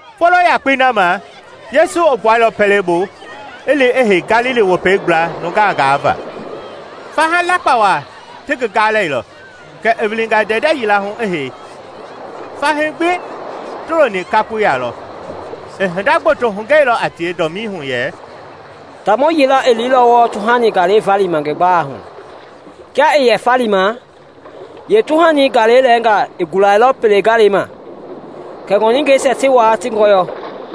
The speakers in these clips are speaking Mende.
Folo yakpei na ma Yesu i gbuailɔ pɛlei bu i li i hei Galili Wopei gbla nuungaa gaavaa. Faha lakpa waa ti ngi gaalɛilɔ, kɛ i wilinga ndɛndɛ yila hu i hei, fahii gbi tia ti looni kakpoi ya. I hinda gboto hugɛilɔ a tie dɔmii hu yɛ, “Taamɔ yila i liilɔ wɔɔ tuhani galei valima ngi gbalɛi hu. Kia i yɛ falima, yeetuhani galei lɛɛnga i gulailɔ pele galei ma, kɛ ŋɔningɛisia ti waa ti ngɔyɔ.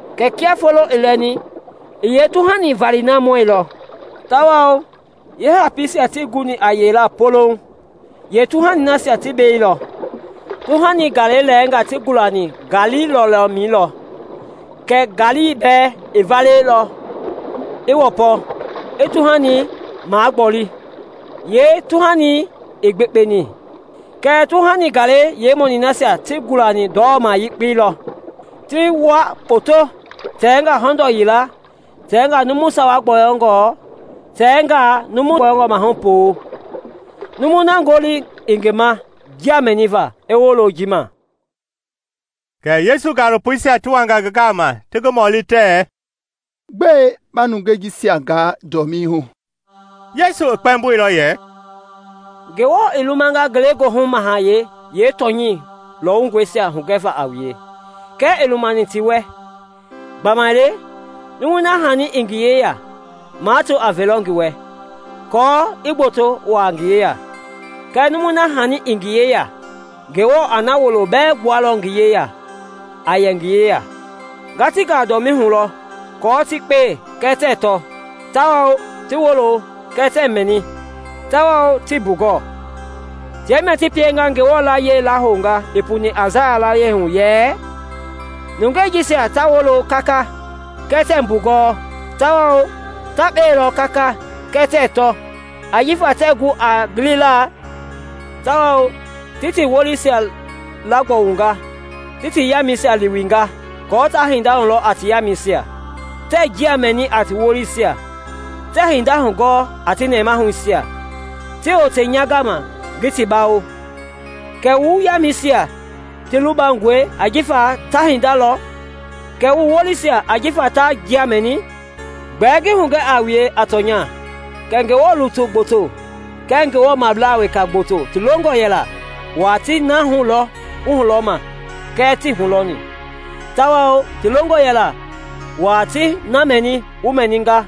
Kɛɛ kia foloi i lɛni, i yeetuhani valeisia mɔilɔ; tawao jifa yeehapiisia tii guni a yeilaa poloŋ, yeetuhanisia ti beilɔ. Tuhani galei lɛɛnga ti gulani ngaali lɔlɔmɛi lɔ, kɛ ngaali bɛɛ i valea, i wɔpɔ, i tuhanii magbɔle, yeetuhanii ii gbekpeni. Kɛɛ tuhani galei yeemɔniisia ti gulani ndɔlɔma yekpei lɔ, ti wua kpoto, tɛnga hɔndɔ yila, tɛnga numu sawa gbɔyɔngɔ, tɛnga numu gbɔyɔngɔ maahu puu.” “Numui na ngoli i ngi ma njia mɛniva, i wolo ji ma.” Kɛ Yesu gaalopoisia ti wanga ngi gama ti ngi mɔli tɛɛ, “Gbɛe ba nungei jisia gaa dɔmii hu?” Yesu i kpɛmboilɔ yɛ, “Ngewɔ i lumanga ngelegoohu mahayɛi yeetɔnya lɔwungɔisia hugɛva a wue, kɛɛ ii lumani ti wɛ. Gbamaile numui na hani i ngi yeya, mato a velɔ ngi wɛ, aako i gboto waa ngi yeya; kɛɛ numui na hani ii ngi yeya, Ngewɔ a na wuloi bɛɛ gbualɔ ngi yeya a yɛ ngi yeya. Nga ti gaa dɔmii hu lɔ aako ti kpee kɛɛ tɛɛ tɔ tawao ti wolo kɛɛ tɛɛ mɛni, tawao tɛɛ mbugɔɔ. Tia mia ti pienga Ngewɔ layiɛi la hounga i puni Aisaya laa yɛ, ‘Nungei jisia ta wololɔ kaka, kɛɛ tɛɛ mbugɔɔ tawao ta kpelɔ kaka kɛɛ tɛɛ tɔ, ajifa tɛɛ gu a gilila, tawao ti ti wolisia laagbɔwunga, ti ti yamɛisia liwinga, aako taa hinda lɔ a ti yamɛisia, ti njia mɛni a ti wolisia, ti hinda hugɔɔ a ti nɛmahuisia, ti wote nya gama ngi ti bawo.’ “Kɛɛ wu yamɛisia ti lubangɔe ajifa ta hinda lɔ, kɛɛ wu wolisia ajifa ta njia mɛni. Gbɛɛ ngi hugɛ a wue a tɔnya kɛ Ngewɔ lutui gboto kɛɛ Ngewɔblaa weka gboto ti longɔ yɛla waa ti na hulɔ wu hulɔma kɛɛ tii hulɔni, tawao ti longɔ yɛla waa ti na mɛni wu mɛnima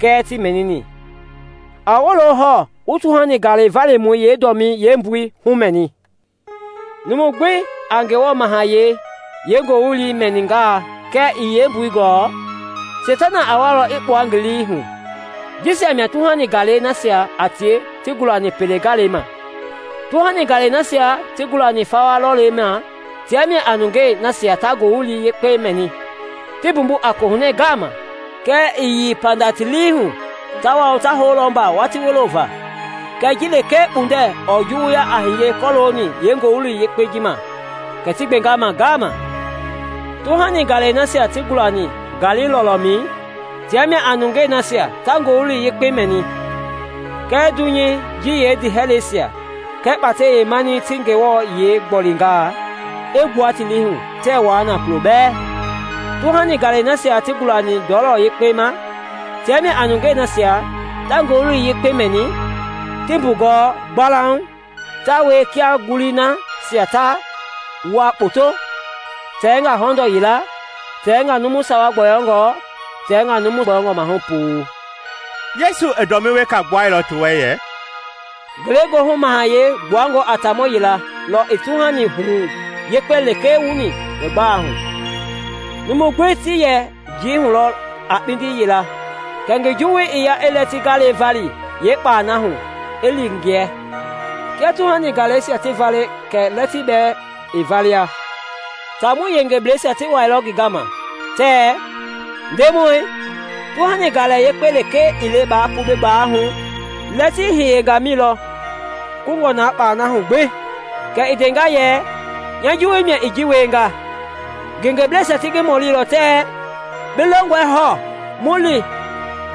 kɛɛ tii mɛnini.” “A wolo hɔɔ wu tuhani galɛ valimɔi yeedɔmii yeembui humɛni. Numu gbi i Ngewɔ Mahayɛi yeengoowili mɛningaa kɛɛ ii yeembui gɔɔ, Seitana a walɔ i kpua ngi lii hu; jisia mia tuhani galei nasia a tie ti gulani pele galei ma. Tuhani galei nasia ti gulani fawa lɔlɔmɛi tia mia a nungei nasia ta Ngowili Yekpei mɛni, ti mbumbu a kohunɛ ngaama; kɛɛ ɛɛ yei panda ti lii hu, tawao ta houlɔ mba watii wulo va. Kɛɛ ji lekee kpundɛ ɔɔ juwuya a hiye kɔlooni yeengoowili ma, kɛ ti gbenga ma ngaama. Tuhani galei nasia ti gulani ngaali lɔlɔmɛi tia mia a nungei nasia ta Ngowili Yekpei mɛni, kɛ dunyei ji yeendiihɛlɛisia kɛɛ kpatɛi yeemanii ti Ngewɔ yiɛi gbolenga, i gbua ti liihu tɛɛ wua kulo bɛɛ. Tuhani galei nasia ti gulani ndɔlɔ yekpei ma tia mia a nungei nasia ta Ngowili Yekpei mɛni, ti mbugɔɔ gbalauŋ; ta wielɔ kia ngulii nasia na ta wua kpoto, tɛnga hɔndɔ yila, tɛnga numu sawa gbɔyɔngɔ, tɛɛnga numu gbɔyɔngɔ maahu puu.” Yesu i dɔmii weka gbuailɔ ti wɛ yɛ, “Ngelegoohu Mahayɛi gbuangɔ a taamɔ yila lɔ i tuhani huwu yekpe lekee wuni ngi gbalei hu. Numui gbi ti yɛ njii hu lɔ a kpindi yila kɛ ngi juwui i ya i lɛtii galei vali yeekpalɛi hu i li ngiɛ. Kia tuhani galeisia ti valeni kɛ lɛtii bɛɛ i valea. Taamɔi yengebleisia ti wɛilɔ ngi gama tɛɛ, ‘Ndemɔi, tuhani galɛ yekpei lekee ii le baa pu bi gbalei hu? Lɛtii i hiyenga mi lɔ kungɔ na kpalɛi hu gbi?’ Kɛ i ndenga yɛ, ‘Nya juwui mia i ji wienga.’ Ngengeblɛisia ti ngi mɔlilɔ tɛɛ, ‘Bi longɔe hɔɔ mu li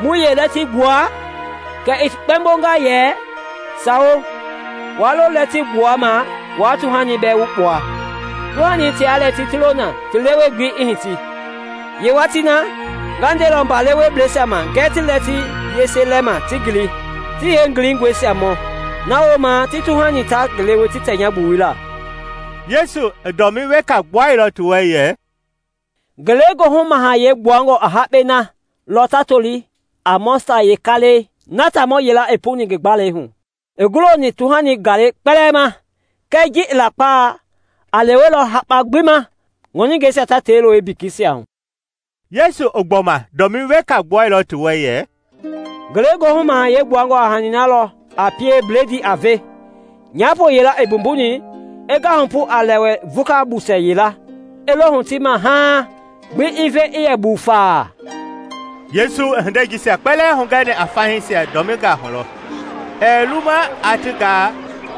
mu yeelɛtii gbua?’ Kɛ i kpɛmbonga yɛ, ‘Sawo, waa lo lɛtii wukpuama waa tuhani bɛɛ wukpua. Tuhani tia lɛtii ti lo na ti lewe-gbelei i hiti. Yeewatii na, nga ndelɔ mba lewebleisia ma ngɛɛ ti lɛtii yese lɛma ti ngili, ti yeengiliisia mɔ; na wooma ti tuhani ta ngi lewe ti tɛ nya gbuwui laa.’” Yesu i dɔmii weka gbuailɔ ti wɛ yɛ, “Ngelegoohu Mahayɛi gbuangɔ a hakpɛi na lɔ ta toli a Mɔstad yeekaalɛi na taamɔ yila i puni ngi gbalei hu. I guloni tuhani galei kpɛlɛɛ ma, kɛɛ ji a lakpa a lewelɔ hakpa gbi ma, ŋɔningɛisia ta tei lo ngi bekeisia hu.” Yesu i gbɔma dɔmii weka gbuailɔ ti wɛ yɛ, “Ngelegoohu Mahayɛi gbuangɔ a hani na lɔ a pie bledii a ve nyaapo yila i mbumbuni i ngahupu a lɛwɛ vuka busɛ yila i lo huti ma haaŋ gbi i ve i yɛ buufa.” Yesu i hindei jisia kpɛlɛɛ hugɛni a fahiisia dɔmingaa hu lɔ; ɛɛ luma aa ti gaa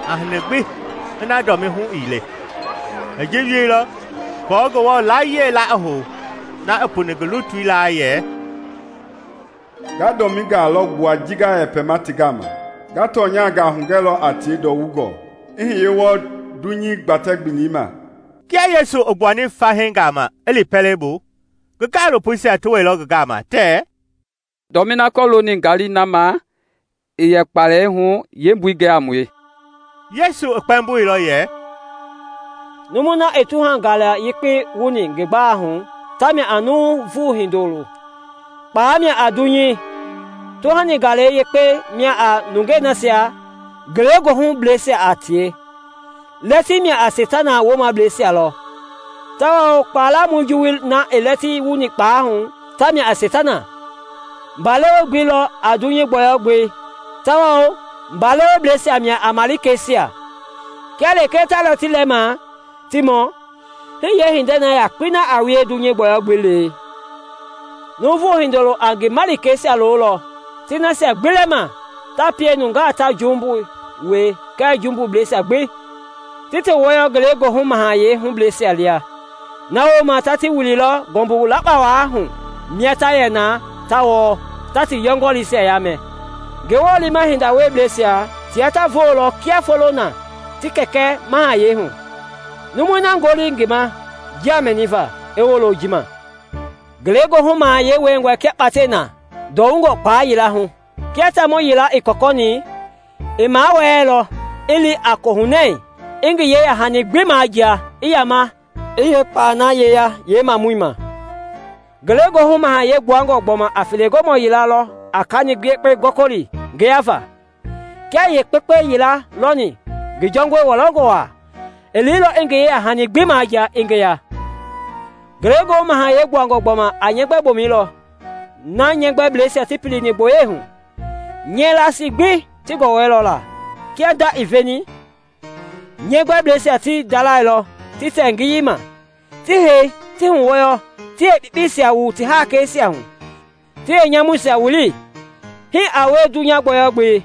a hani gbi ina dɔmii hu ii le. I ji wieilɔ aako Ngewɔ layie la i hou na i puni ngi lutui laa yɛ, “Nga dɔmingaa lɔ gbua ji nga yɛ yɛpɛma ti gama, nga tɔnyangaa hugɛlɔ a tie ndɔwungɔ i hiye wɔɔ dunyei gbatɛ-gbelei ma.” Kia Yesu i gbuani fahii gama i li pɛlei bu, ngi gaalopoisia ti wɛilɔ ngi gama tɛɛ, “Dɔmii na kɔlooni ngaali na ma i yɛ kpalɛi hu yeembui gɛ a mue.” Yesu i kpɛmboilɔ yɛ, “Numui na i tuhani galɛ yekpei wuni ngi gbalei hu tamia a Nuuvu Hindoloi; kpalɛi mia a dunyei; tuhani galɛ yekpei mia a nungei nasia ngelegoohuliblɛisia a tie; lɛtii mia a Seitana woomableisia, tawao kpala lamɔi juwui na i lɛtii wuni kpalɛi hu tamia a Seitana. Mba lewe-gbelei lɔ a dunyei gbɔyɔ-gbelei tawao mba lewebleisia mia a malikeisia. Kia lekee ta lɛtii lɛla ma, ti mɔ, hii yeehinda yakpei na a wie dunyei gbɔyɔ-gbelei. Nuuvu Hindoloi a ngi malikeisia lolɔ ti nasia gbi lɛma ta pie nungaa ta jumbu wie kɛɛ jumbubleisia gbi ti ti wɔyɔ Ngelegoohu Mahayɛi hubleisia lia. Na wooma ta ti wililɔ ngɔmbu lakpa waa hu mia ta yɛ na ta wɔɔ, ta ti yɔngɔlii yaamɛ. Ngewɔ liima hinda wieblɛisia tia ta voolɔ kia foloi na ti Kɛkɛ Mahayɛi hu. Numui na ngoli i ngi ma njia mɛniva, i wolo ji ma. “Ngelegoohu Mahayɛi wiengɔe kia kpatɛi na ndɔwungɔ kpala yila hu. Kia taamɔ yila i kɔkɔni, i mawɛɛlɔ, i li a kohunɛ, i ngi yeya-hani gbi majia, i yaama i yeekpalɛi na yeya yeemamɔi ma. “Ngelegoohu Mahayɛi gbuangɔ gbɔma a felegɔmɔ yila lɔ a kani yekpengaa gɔkɔli ngeyava. Kia i yeekpekpe yila lɔni ngi jɔngɔi wɔlɔngɔ waa, i liilɔ i ngi yeyahani gbi majia, i ngeya. “Ngelegoohu Mahayɛi gbuangɔ gbɔma a nyɛgbɛbomɛi lɔ na nyɛɛ gbɛbleisia ti pilini gboyei hu, nyɛɛ laasii gbi ti gɔwɔ la. Kia nda i veni, nyɛɛ gbɛbleisia ti ndalɛilɔ ti tɛ ngiyei ma, ti hei, ti huwɔyɔ, ti yeekpekpeisia wu ti haakeisia hu, ti yeenyamuisia wili. Hii a wie dunyei gbɔyɔ-gbelei.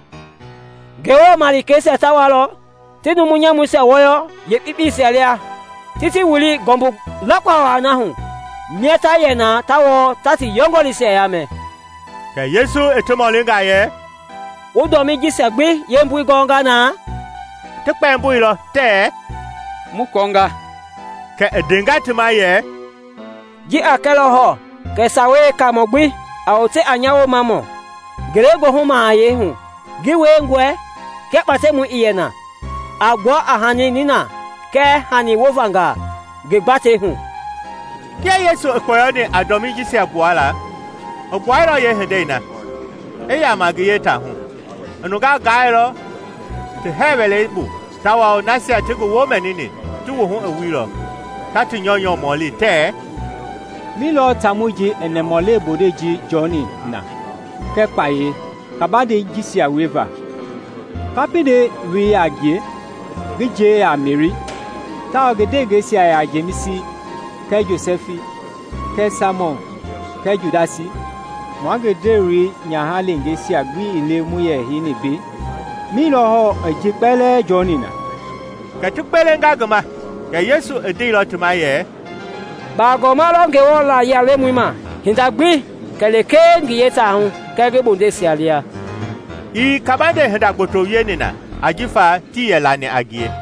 Ngewɔ malikeisia ta walɔ ti numu nyamuisia wɔyɔ yeekpekpeisia lia, ti ti wili ngɔmbu lakpa waa hu, mia ta yɛ na ta wɔɔ ta ti yɔngɔliisia yaamɛ.” Kɛ Yesu i ti mɔlinga yɛ, “Wu dɔmii jisia gbi yeembui gɔnga na?” Ti kpɛmboilɔ tɛɛ, “Mu kɔɔnga.” Kɛ i ndenga ti ma yɛ, “Ji a kɛlɔ hɔɔ kɛ Sawei Yeekaamɔ gbi a wote a nya Woomamɔ Ngelegoohu Mahayɛi hu ngi wiengɔe kia Kpatɛmɔ i na, a gbua a hani ninangaa kɛɛ hani wovangaa ngi gbatei hu.” Kia Yesu i kpɔyɔni a dɔmii jisia gbuala, i gbuailɔ yee hindei na, i yaama ngi yee taahu. I nungaa gaailɔ ti hɛɛ wɛlei bu tawao nasia ti ngi woo mɛnini ti wuhu i wuilɔ, ta ti nyɔunyɔ mɔli tɛɛ, “Mi lɔ taamɔi ji i nɛmahulewe bondei ji jɔni na kɛɛ kpayei kabande yengei jisia wieva? Kapindɛi loi yaa a ngie? Ngi nje yaa a Meri, tawao ngi ndewengeisia yaa a Jemisi kɛɛ Josɛfi kɛɛ Saimɔn kɛɛ Judasi? Mua ngi ndewe nyaha leengeisia gbi ii le mua yɛ heini mbei? Mi lɔ hɔɔ i ji kpɛlɛɛ jɔni na?” Kɛ ti gbelenga ngi ma. Kɛɛ Yesu i ndeilɔ ti ma yɛ, “Bagɔma lɔ Ngewɔ layia-lemɔi ma hinda gbi kɛ lekee ngi yeetaahu kɛɛ ngi bondeisia lia.” Ii kabande hinda gboto wieni n a ajifa tii yɛ lani a ngie.